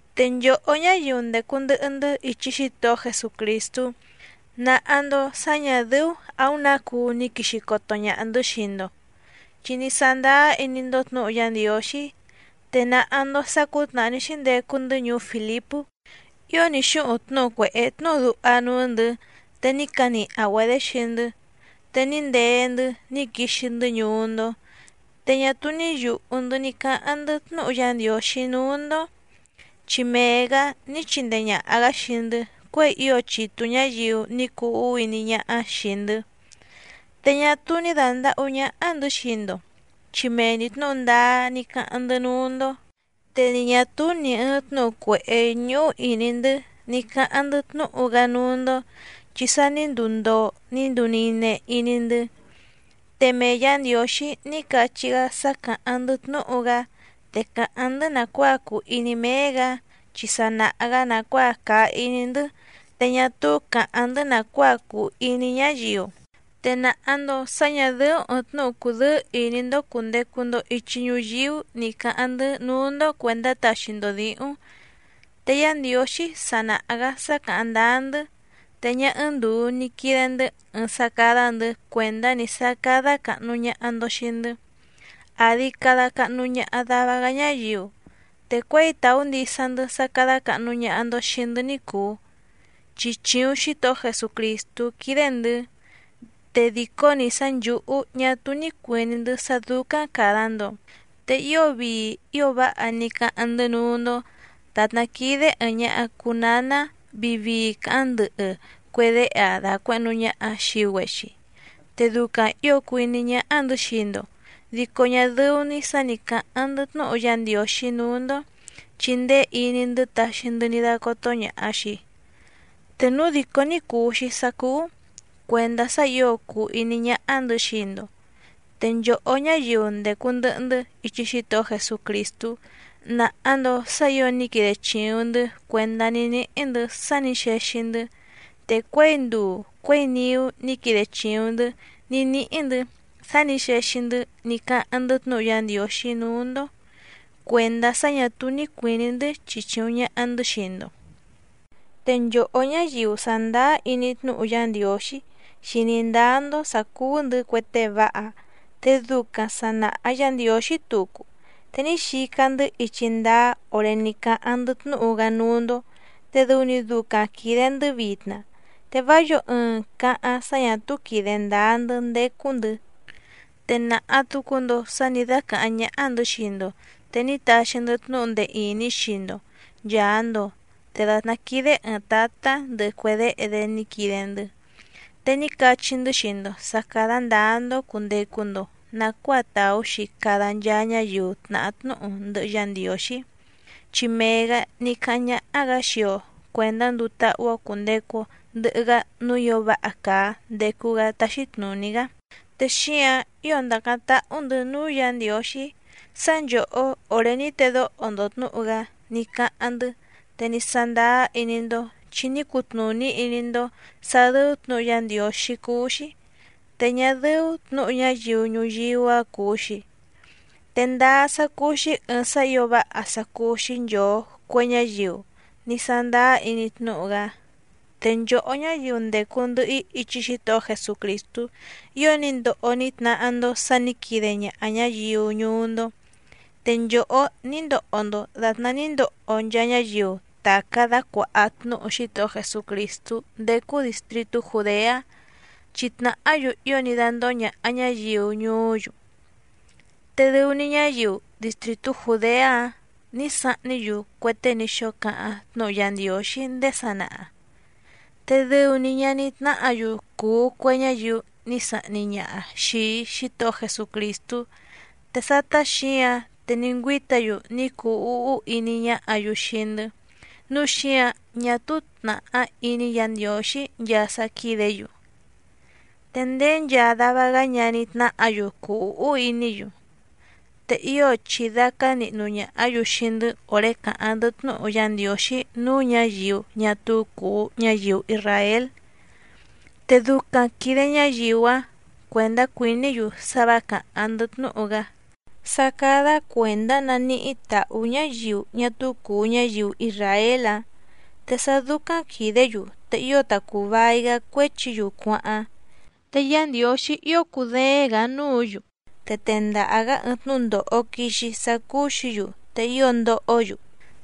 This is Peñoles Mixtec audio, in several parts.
Te nchòhó ñáyiu ndècu ndɨhɨ‑ndɨ́ ichi Xítohó Jesucrìstú nàha‑ndo sá ñà dɨ́ú àúⁿ nǎ cuu ni quìxi coto ñaha‑ndɨ́ xii‑ndo, chi ní sándáá iní‑ndó tnǔhu Yá Ndiǒxí. Te nàha‑ndo sá cǔtnàhá ní xíndecu‑ndɨ́ ñuú Fìlipú ío ní xúhuⁿ tnúhu cuèhé tnúhu duha núú‑ndɨ̌, te ní caniha‑güedě xii‑ndɨ́. Te ní ndee‑ndɨ́ ní quixi‑ndɨ́ ñuú‑ndó, te ñá túú ní yùhú‑ndɨ́ ní cáháⁿ‑ndɨ́ tnúhu Yá Ndiǒxí núú‑ndó, chi mee‑gǎ ní chindee ñàha‑gá xii‑ndɨ́ cuěi ío chitu ñǎyiu ní cuu úhú iní ñáhá xìi‑ndɨ́. Te ñá túú ní dàndahú ñáhá‑ndɨ̌ xii‑ndo chi mee‑ni tnǔhu ndáá ní cáháⁿ‑ndɨ́ núú‑ndó, te ni ñà túú nì ɨɨⁿ tnúhu cuèhé ñúhú ìní‑ndɨ́ ní cáháⁿ‑ndɨ́ tnúhu‑gá núú‑ndó chi sa ní nduu ndoo ní nduu nine iní‑ndɨ́. Te mee Yǎ Ndiǒxí ní cachí‑gá sá càháⁿ‑ndɨ́ tnúhu‑gá, te càháⁿ‑ndɨ́ nàcuáa cùu iní méé‑gǎ, chi sa nàha‑gá nàcuáa càa iní‑ndɨ́, te ñá túú càháⁿ‑ndɨ́ nàcuáa cùu iní ñáyiu. Te nàha‑ndo sá ñà dɨ́ú ɨ̀ɨⁿ tnúhu cudɨ́ɨ́ ìní‑ndó cùndecu‑ndo ichi ñuyíú ní cǎháⁿ‑ndɨ́ núú‑ndó cuèndá taxi‑ndo dǐhúⁿ. Te Yá Ndiǒxí sa nàha‑gá sá càháⁿ ndáá‑ndɨ́. Te ñá ɨ́ɨ́ⁿ ndùu ni quide‑ndɨ́ ɨɨⁿ sá cádá‑ndɨ̌ cuèndá‑ni sá cádá càhnu ñaha‑ndo xii‑ndɨ́, àdi cada cahnu ñaha dava‑gá ñáyiu, te cuěi tàú ndisa‑ndɨ́ sá cádá càhnu ñaha‑ndo xii‑ndɨ́ ní cùu, chi chìuⁿ Xítohó Jesucrìstú quídé‑ndɨ̌, te dìcó‑ni sá nchǔhú ñá túú ní cuìní‑ndɨ́ sá dúcáⁿ càda‑ndo. Te ío vii ío váha ní cáháⁿ‑ndɨ́ núú‑ndó, dàtná quídé ɨ̀ɨⁿ ñaha cuu náná vii vii càháⁿ ndɨhɨ cue déhe‑aⁿ dàcuehnu ñaha‑aⁿ xii‑güexi. Te ducaⁿ ǐo cùu iní ñáhá‑ndɨ̌ xii‑ndo, dico ñá dɨ́ú‑ní sǎ nǐ cáháⁿ‑ndɨ́ tnúhu Yá Ndiǒxí núú‑ndó, chi ndéé iní‑ndɨ́ taxi‑ndɨ́ ní dácótó ñàha‑xi, te núu dìcó ní cùu‑xi sá cúú, cuèndá sá ǐo cùu iní ñáhá‑ndɨ̌ xii‑ndo. Te nchòhó ñáyiu ndècu ndɨhɨ‑ndɨ́ ichi Xítohó Jesucrìstú nàha‑ndo sá ǐo ní quide chìuⁿ‑ndɨ́ cuèndá ní níhí‑ndɨ̌ sá nǐ xexi‑ndɨ́. Te cuěi nduu cuěi niú ní quide chìuⁿ‑ndɨ́ ní níhí‑ndɨ̌ sá nǐ xexi‑ndɨ́ ní cáháⁿ‑ndɨ́ tnúhu Yá Ndiǒxí núú‑ndó cuèndá sá ñà túú ní cuìní‑ndɨ́ chichìuⁿ ñaha‑ndɨ́ xii‑ndo. Te nchòhó ñáyiu sàndáá iní tnúhu Yá Ndiǒxí xìní ndáá‑ndó sǎ cúú‑ndɨ̌ cue tée váha te ducaⁿ sà naha Yá Ndiǒxí tucu, te ní xica‑ndɨ́ ichi ndáá òré ní cáháⁿ‑ndɨ́ tnúhu‑gá núú‑ndó te dɨu‑ni ducaⁿ quìde‑ndɨ́ vitna. Te vá yǒo ɨɨⁿ càháⁿ sá ñà túú quìde ndáá‑ndɨ́ ndécú‑ndɨ̌. Te nàha tucu‑ndo sá nǐ dácàháⁿ ñáhá‑ndɨ̌ xii‑ndo, te ní taxi‑ndɨ́ tnúhu ndee ìní xii‑ndo nchàa‑ndo, te dàtná quídé ɨ̀ɨⁿ tátá ndɨhɨ cue déhe‑dé ní quide‑ndɨ́. Te ní cachí‑ndɨ́ xii‑ndo sǎ cádá ndǎá‑ndó cùndecu‑ndo nacuáa tàú‑xi cada nchaa ñáyiu tnàhá tnúhu ndɨhɨ Yá Ndiǒxí, chi mee‑gǎ ní cáháⁿ ñáhá‑gǎ xii‑o cuèndá nduu táhú‑ó cùndecu‑o ndɨhɨ‑gá núú ǐo váha càa ndecu‑gá táxí tnùní‑gá. Te xíǎⁿ ío ndàcáⁿ táhú‑ndɨ̌ núú Yǎ Ndiǒxí sá nchòhó òré ní tedóho‑ndo tnǔhu‑gá ní cáháⁿ‑ndɨ́, te ní sándáá iní‑ndó chi ní cutnùní iní‑ndó sǎ dɨ́ú tnǔhu Yá Ndiǒxí cúú‑xí, te ñá dɨ́ú tnǔhu ñáyiu ñuyíú‑a cùu‑xi. Te ndáá sá cúú‑xí ɨ̀ɨⁿ sá ǐo váha sá cúú‑xí nchòo cue ñáyiu ní sándáá iní tnúhu‑gá. Te nchòhó ñáyiu ndècu ndɨhɨ‑í ichi Xítohó Jesucrìstú, ío ní ndoho ní tnahá‑ndó sǎ nǐ quide ñaha ñǎyiu ñuú‑ndó. Te nchòhó ní ndoho‑ndo dàtná ní ndoho nchaa ñáyiu tàcá dácuàha tnúhu Xítohó Jesucrìstú ndécú dìstritú Jùdeá, chi tnàhá‑yu ío ní dándóhó ñàha ñáyiu ñuú‑yu. Te dɨu‑ni ñáyiu distrìtú Jùdeá‑áⁿ nǐ sahní‑yu cue tée ní xóo cáháⁿ tnúhu Yá Ndiǒxí ndéé sanaha. Te dɨu‑ni ñaní tnáhǎ‑yu cùu cue ñáyiu ní sahni ñaha xìi Xítohó Jesucrìstú, te sátá xǐǎⁿ te ní ngüíta‑yu ní cuu úhú iní ñáhǎ‑yu xii‑ndɨ́, núu xíǎⁿ ñá túú tnàhá iní Yǎ Ndiǒxí nchaa sá quídě‑yu, te ndéé nchaa dava‑gá ñaní tnáhǎ‑yu cùu úhú iní‑yu. Te ío chìdácá nihnu ñàhá‑yu xii‑ndɨ́ òré càháⁿ‑ndɨ́ tnúhu Yá Ndiǒxí núú ñǎyiu ñá túú cùu ñáyiu isràél, te ducaⁿ quìde ñáyiu‑áⁿ cuèndá cuìní‑yu sá vǎ càháⁿ‑ndɨ́ tnúhu‑gá, sá cádá cuèndá naníhí tàhú ñáyiu ñá túú cùu ñáyiu isràél‑áⁿ, te sá dúcáⁿ quìdé‑yu te ío ta cùu vai‑gá cuéchi‑yu cuáháⁿ. Te Yá Ndiǒxí ío cùdééⁿ‑gǎ núǔ‑yu, te tendaha‑gǎ ɨɨⁿ tnúndòho quixi sá cúú‑xǐ‑yu te ío ndohó‑yu.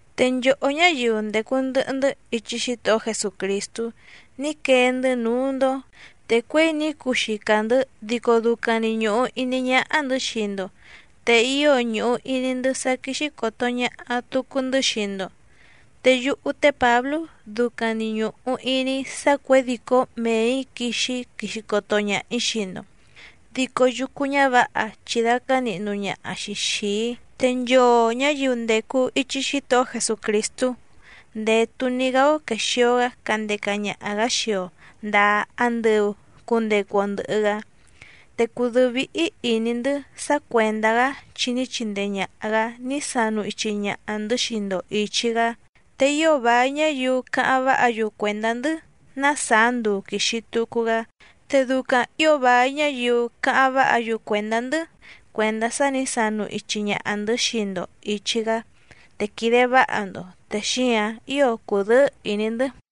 Te nchòhó ñáyiu ndècu ndɨhɨ‑ndɨ́ ichi Xítohó Jesucrìstú ní quee‑ndɨ́ núú‑ndó, te cuěi ní cuxica‑ndɨ̌ dico ducaⁿ‑ni ñùhu iní ñáhá‑ndɨ̌ xii‑ndo, te ío ñùhu iní‑ndɨ́ sá quíxí còto ñaha tucu‑ndɨ́ xii‑ndo. Te yúhú té Pǎblú ducaⁿ‑ni ñùhu iní‑í sá cuědìcó méè‑í quixi‑í, quixi coto ñaha‑ǐ xii‑ndo, dico yucu ñǎvǎha chìdácá nihnu ñaha‑xi xìi‑í. Te nchoo ñǎyiu ndècu ichi Xítohó Jesucrìstú ndètu‑ni‑gá‑ó quèxio‑gá candeca ñaha‑gǎ xii‑o ndàa andɨu cundecu‑o ndɨhɨ‑gá. Te cùdɨ́ɨ́ víhí ìní‑ndɨ́ sá cuèndá‑gá chi ní chindee ñàha‑gá ní sanu ichi ñaha‑ndɨ̌ xii‑ndo ìchi‑gá, te ío vài ñáyiu cáháⁿ váha‑yu cuèndá‑ndɨ́ ná sàá nduu quìxi tucu‑gá. Te ducaⁿ ǐo vài ñáyiu cáháⁿ váha‑yu cuèndá‑ndɨ́ cuèndá sá nǐ sanu ichi ñaha‑ndɨ̌ xii‑ndo ìchi‑gá, te quìde váha‑ndo. Te xíǎⁿ ío cùdɨ́ɨ́ ìní‑ndɨ́.